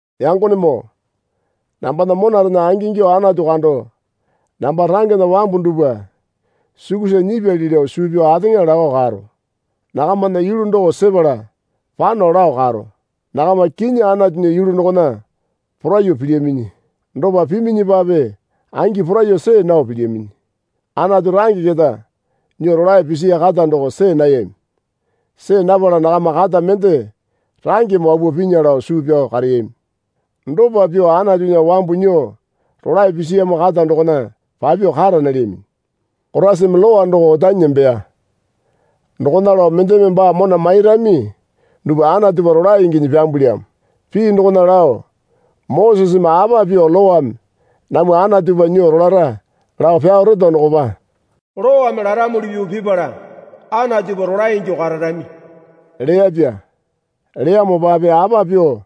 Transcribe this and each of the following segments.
Yangonemoo, nambana monarena angingyuo Anatu kando namba rangena wambu dupwa sukusa nyipyali lao suu pyao ateŋa lakao karo. Nakamana yulu doko sepala pano lao karo. Nakama kinyi Anatunya yulu dokona poraiyuo pilyaminyi. Dopa piminyipape angi poraiyuo see nao pilyaminyi. Anatu range keta nyuo rolae pisiya kata doko see nayami. See napala nakama kata mende rangeme wapuo pinya lao suu pyao kareyami. Dopa pyuo Anatunya wambu nyuo rolae pisiyamo kata dokona papyuo kara nalyaminyi. Koraisame Lowa doko otanyi nembeya. Dokona lao mendeme baa mona mairami dupwa Anatupa rolae inginyi pyambulyamo. Pii dokona lao Moseseme apa pyuo Lowame namwa Anatupa nyuo rolara lao pyao reto dokopa, Lowame laramuli pyuo pipala Anatupa rolae ingyuo kararami leyapya. Leyamopape apa pyuo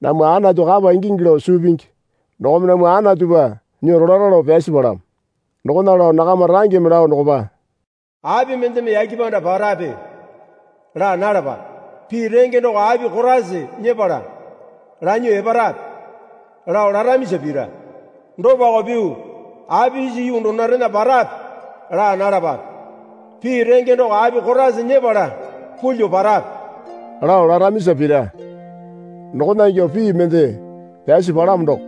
namwa Anatu kapa ingingi lao suu pingi dokome namwa Anatupa nyuo rolara lao pyasi palamo. Dokona lao nakama rangeme lao dokopa, Api mendeme yake panda parape? laa nalapape. Pii renge doko api Koraisa nyepala lanyuo eparape? lao laramisa pira. Dopako pyuo, Api isa yuu dunurena parape? laa nalapape. Pii renge doko api Koraisa nyepala pulyuo parape? lao laramisa pira. Dokona ingyuo pii mende pyasi palamo doko.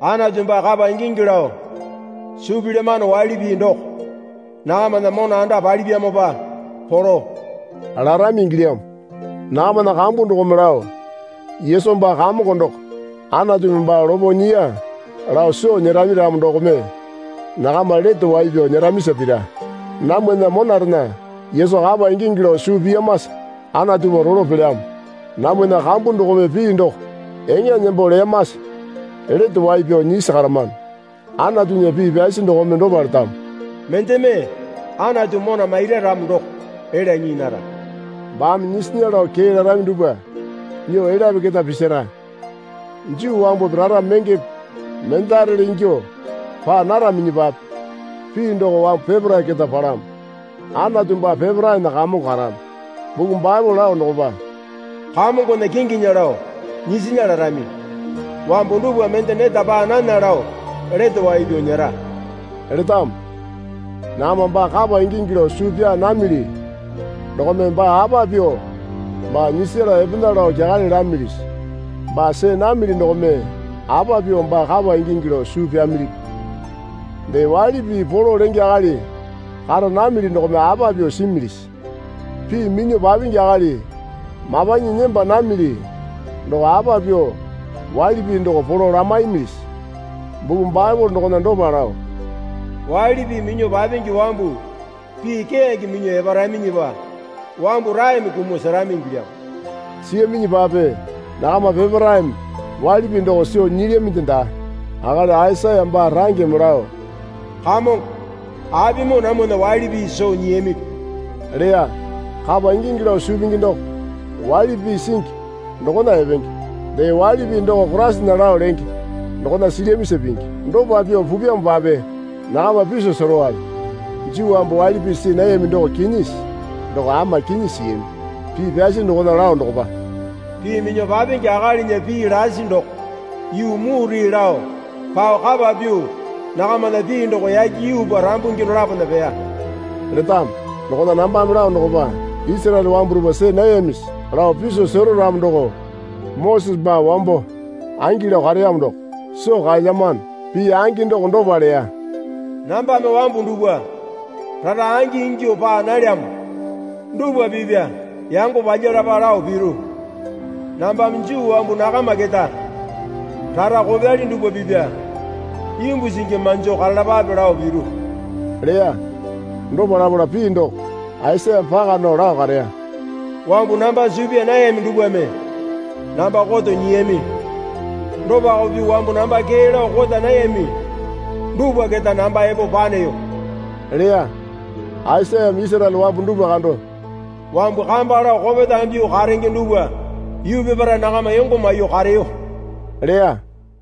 Anatu baa kapa ingingi lao suu pilyamano waili pii doko nakamana mona anda palipyamopa polo larami ingilyamo. Nakamana kambu dokome lao, Yesu baa Kamongo doko Anatumi baa lopo nyiya lao soo nyerami ramo dokome nakama lete wai pyao nyeramisa pira. Namwana monarena Yesu kapa ingingi lao suu piyamasa Anatupa rolo pelyamo. Namwana kambu dokome pii doko eŋa nembo leyamasa lete wai pyao nyisi karamano. Anatunya pii pyasi dokome dopa letamo. Mendeme Anatu mona maira ramo doko elya nyii nara. Baame nyisinya lao kee larami dupwa nyuo elyapi keta pisara. Juu wambupi rara mengepe mendarele ingyuo paa naraminyipape pii doko wambu peparae keta palamo. Anatu baa peparaena Kamongo karamo. Buku Baepole lao dokopa, Kamongona kinginya lao nyisinya larami wambu dupwa mende neta paa nana lao lete wai pyao nyera letamo. Nakama baa kapa ingingi lao suu pyaa namili dokome baa apa pyuo baa nyisala epena lao kyakale lamilisi? Baa see namili dokome apa pyuo baa kapa ingingi lao suu pyamilipi? Dee waili pii polo lenge akali kara namili dokome apa pyuo similisi? Pii minyuo papingi akali mapanyi nemba namili doko apa pyuo waili pii doko polo lamaimilisi? Buku Baepole dokona dopa lao, Waili pii minyuo papingi wambu pii keyange minyuo eparaminyipa wambu raeme kumuo serami ingilyamo. Siyaminyipape nakama peparaeme waili pii doko soo nyilyaminde daa. Akali Aisaya baa rangeme lao, Kamongo apimoo namwana waili pii soo nyiyamipi? leya. Kapa ingingi lao suu pingi doko waili pii singi dokona epenge. Dee waili pii doko Koraisana lao lenge dokona silyamisa pingi. Dopa pyuo pupyamopape nakama piso serowale. Juu wambu waili pii see nayami doko kinyisi? Doko ama kinyi siyami. Pii pyasi dokona lao dokopa, Pii minyuo papingi akalinya pii lasi doko yuu mure lao pao kapa pyuo nakamana pii doko yake yuupa rambungi dolapona peya letamo. Dokona nambame lao dokopa, Isaraele wambu dupwa see nayamisi? lao piso sero ramo doko Mosese baa wambo angi lao kareyamo doko soo kaelyamano. Pii angi doko dopa leya. Nambame wambu dupwa rara angi ingyuo paa nalyamo dupwa pipya yango palyalapa lao piru. Nambame Juu wambu nakama keta rara kopyali dupwa pipya imbu singi manjo karalapale lao piru leya. Dopa lapala pii doko Aisayame paka nao lao kareya. Wambu namba suu pyaa nayami dupwame namba koto nyiyami. Dopako pyuo wambu namba kee lao kota nayami dupwa keta namba epo paneyo leya. Aisayame Isaraele wambu dupwa kando, Wambu kamba lao kopetame pyuo karenge dupwa yuu peparae nakama yongo maiyuo kareyo leya.